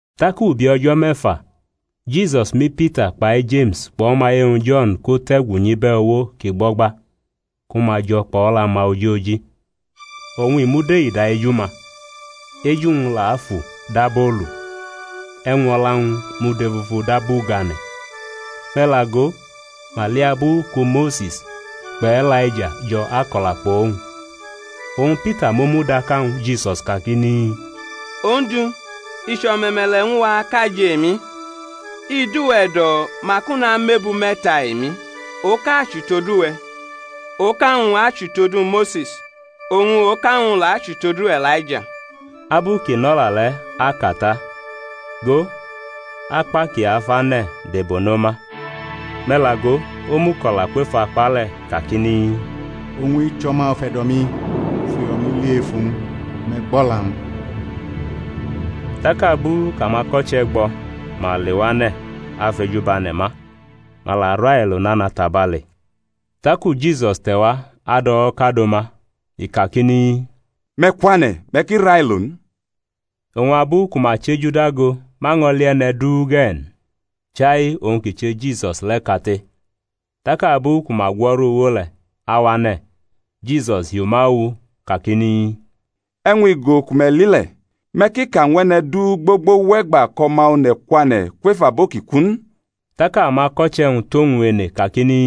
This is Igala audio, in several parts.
Tak ubi o̩jo̩ me̩fa, Jisus mʼiPita kpai Jeme̩s kpʼo̩maye-wñ Jo̩n ko-te̩gu nyʼibe̩ uwo kʼi gbo̩gba ku ma jo̩ kpʼo̩la-ma ojoji. Oñ i mud eida eju-ma, eju-wñ la fu dab olu, e̩wñ o̩la-wñ mud efufu dab ugane̩. Me̩ la go, ma li abu ku Mose̩s kpʼE̩laija jo̩ ako̩la kpʼowñ. Oñ Pita mʼomu da ka ñwu Jisus kakini, Ondu, i chʼo̩me̩me̩le̩ ñw a kʼa jʼemi: i dʼuwe̩ e̩do̩ mak u namʼebu me̩ta emi; oka achʼutodu we̩, oka-wñ achʼutodu Mose̩s, oñ oka-wñ la achʼutodu E̩laija. Abu kʼi nʼo̩la le̩ aka ta, go, akpa kʼi afane̩ debono ma; me̩ la go, omuko̩la kwef akpa le̩ kakini, Owñ-i chʼO̩ma ufe̩do̩-mi kʼu fʼuyo̩-mi li ef uwñ; me̩ gbʼo̩la-wñ. Tak abu kʼamako̩che̩ gbʼo̩, ma lewane̩ afʼeju bʼane̩ ma; ma la railo nana tabale. Taku Jisus te̩wa adʼo̩wo̩ kado ma, i kakini, Me̩ kwane̩, me̩ ki railo n. Oñ abu ku ma chʼeju dago ma ño̩ li e̩ne̩ du ge̩ n, chai owñ kʼi che Jisus le̩ kate. Tak abu ku ma gwo̩ru uwo le̩ awane̩, Jisus hi uma owu kakini, E̩wñ igo ku me̩ li le̩, me̩ ki ka ñw e̩ne̩ du gbogbo wʼe̩gba kʼO̩ma One̩ kwane̩ kwef abo ki ku n. Tak amako̩che̩-wñ tʼowñ ene kakini,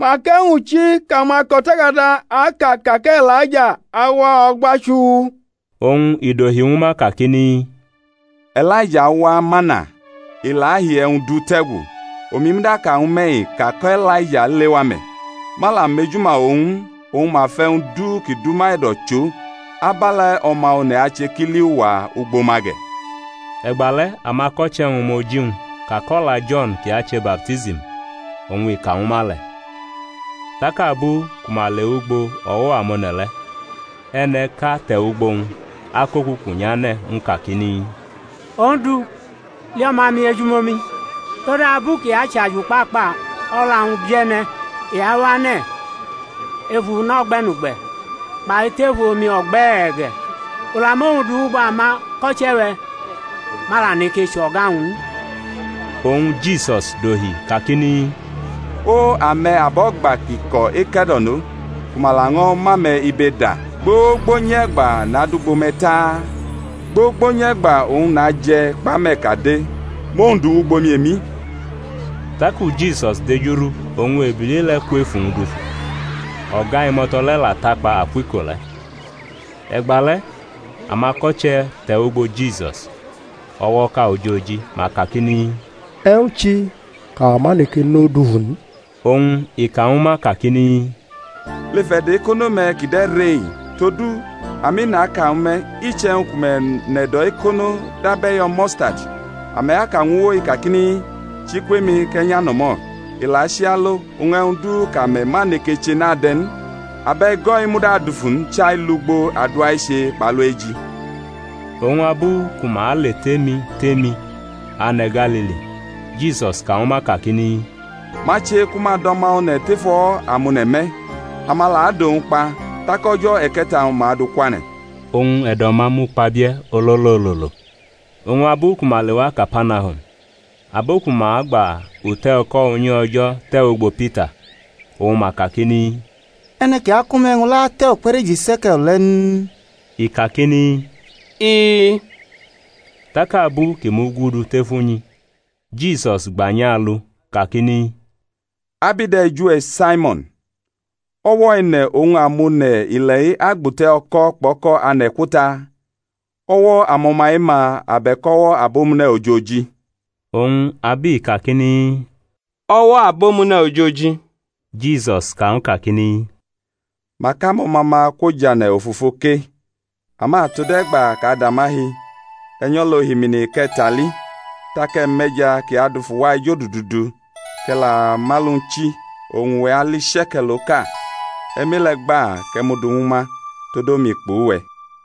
Mak e̩wñ chi kʼamako̩takada aka ka kʼE̩laija awa o̩gba chuu? Oñ i dohi ñwu ma kakini, E̩laija awa mana, i la ahi e̩wñ du tʼe̩gu. Omi muda aka ñwu me̩-i ka kʼE̩laija lewa me̩, ma la mejuma owñ n, oñ ma fʼe̩wñ du ki dʼuma e̩do̩ chʼo. Abe̩le̩ O̩ma One̩ ache kʼi li uwa ugbo ma ge̩. E̩gba le̩ amako̩che̩-wñ mʼoji-wñ ka kʼo̩la Jo̩n kʼi ache baptism, oñ i ka ñwu ma le̩. Tak abu ku ma le wʼugbo o̩wo̩ amone̩ le̩, e̩ne̩ʼka te̩ wʼugbo-wñ akʼokuku nyʼane̩ ñw u kakini, Ondu, li o̩ma-mi ejumomi, todabu kʼi achʼajukpakpa o̩la-wñ bie̩ne̩. I awane̩ ef una o̩gbe̩nugbe̩, kpai tef omi o̩gbe̩e̩ ge̩. U la mʼowñ du wʼugbo amako̩che̩-we̩, ma la neke chʼo̩ga-wñ n. Oñ Jisus dohi kakini, O, ame̩ abo̩gba kʼi ko̩ eke̩do̩no, ku ma laño̩ mʼame̩ ibe da, gbogbo nyʼe̩gba nadʼugbo me̩ ta? Gbogbo nyʼe̩gba oñ naje̩ kpʼame̩ kade? Mʼowñ du wʼugbo-mi emi. Taku Jisus dejurʼu oñ ebili le̩ kwʼef uwñ dufu; o̩ga imo̩to̩ le̩ la takpa akwʼiko le̩. E̩gba le̩ amako̩che̩ te̩wʼugbo Jisus o̩wo̩ʼka ojoji, ma kakini, E̩wñ chi kʼawa ma neke nʼo dufu n? Oñ i ka ñwu ma kakini, Lef e̩do̩ ekono-me̩ kʼi de̩ re-i. Todu, ami, naka ñwu me̩, iche̩wñ ku me̩ nʼe̩do̩ ekono dab e̩yo̩ mustadi, ame̩ aka ñw uwo-i kakini, Chi kwʼemi kʼe̩ nyʼano̩mo̩, i la achi alo, oñ e̩wñ du kʼome̩ ma neke che n ade̩ n. [ Abʼe̩go̩-i muda adufu n, chai lugbo adua eche kpʼalu eji.] Oñ abu ku ma aletʼemi tʼemi ane̩ Galili Jisus ka ñwu ma kakini, Ma che ku ma dʼO̩ma One̩ tef o̩wo̩ amone̩ me̩. Ama la adʼowñ kpa, tak o̩jo̩ e̩ke̩ta-wñ ma adʼu kwane̩. Oñ e̩do̩-ma mukpabie̩ ololo ololo. Oñ abu ku ma lewa Kapanahum, abo ku ma gba ute̩ o̩ko̩ unyi O̩jo̩ te̩wʼugbo Pita oñ ma kakini, E̩ne̩ kʼi akʼume̩ e̩wñ le̩ ate̩ ukpe̩reji she̩ke̩l le̩ n? I kakini, I-i. Tak abu kʼi mugudu tef unyi Jisus gba nyʼa alu kakini, Ab i de̩ eju-we̩, Saimo̩n? O̩wo̩ e̩ne̩ oñ amonu ile̩-i agbʼute̩ o̩ko̩ kpʼo̩ko̩ ane̩ kwo ta? O̩wo̩ amo̩na e-ma? abe̩k o̩wo̩ abomune̩ ojoji? Oñ ab i kakini, O̩wo̩ abomune̩ ojoji, Jisus ka ñw u kakini, Mak amo̩ma-ma kwojʼane̩ ofofo ke. Ama tode̩gba kʼa da ma hi, e̩ nyʼo̩la ohimmi kʼe̩ tʼali, tak e̩ mʼe̩ja kʼi adufu wa ejodudu du, kʼe̩ la mʼalu-wñ chi, oñ uwe̩ ali she̩ke̩l oka; e̩ mʼe-le̩ gba kʼe̩ mʼu du ñwu ma tod omi kpʼuwe̩.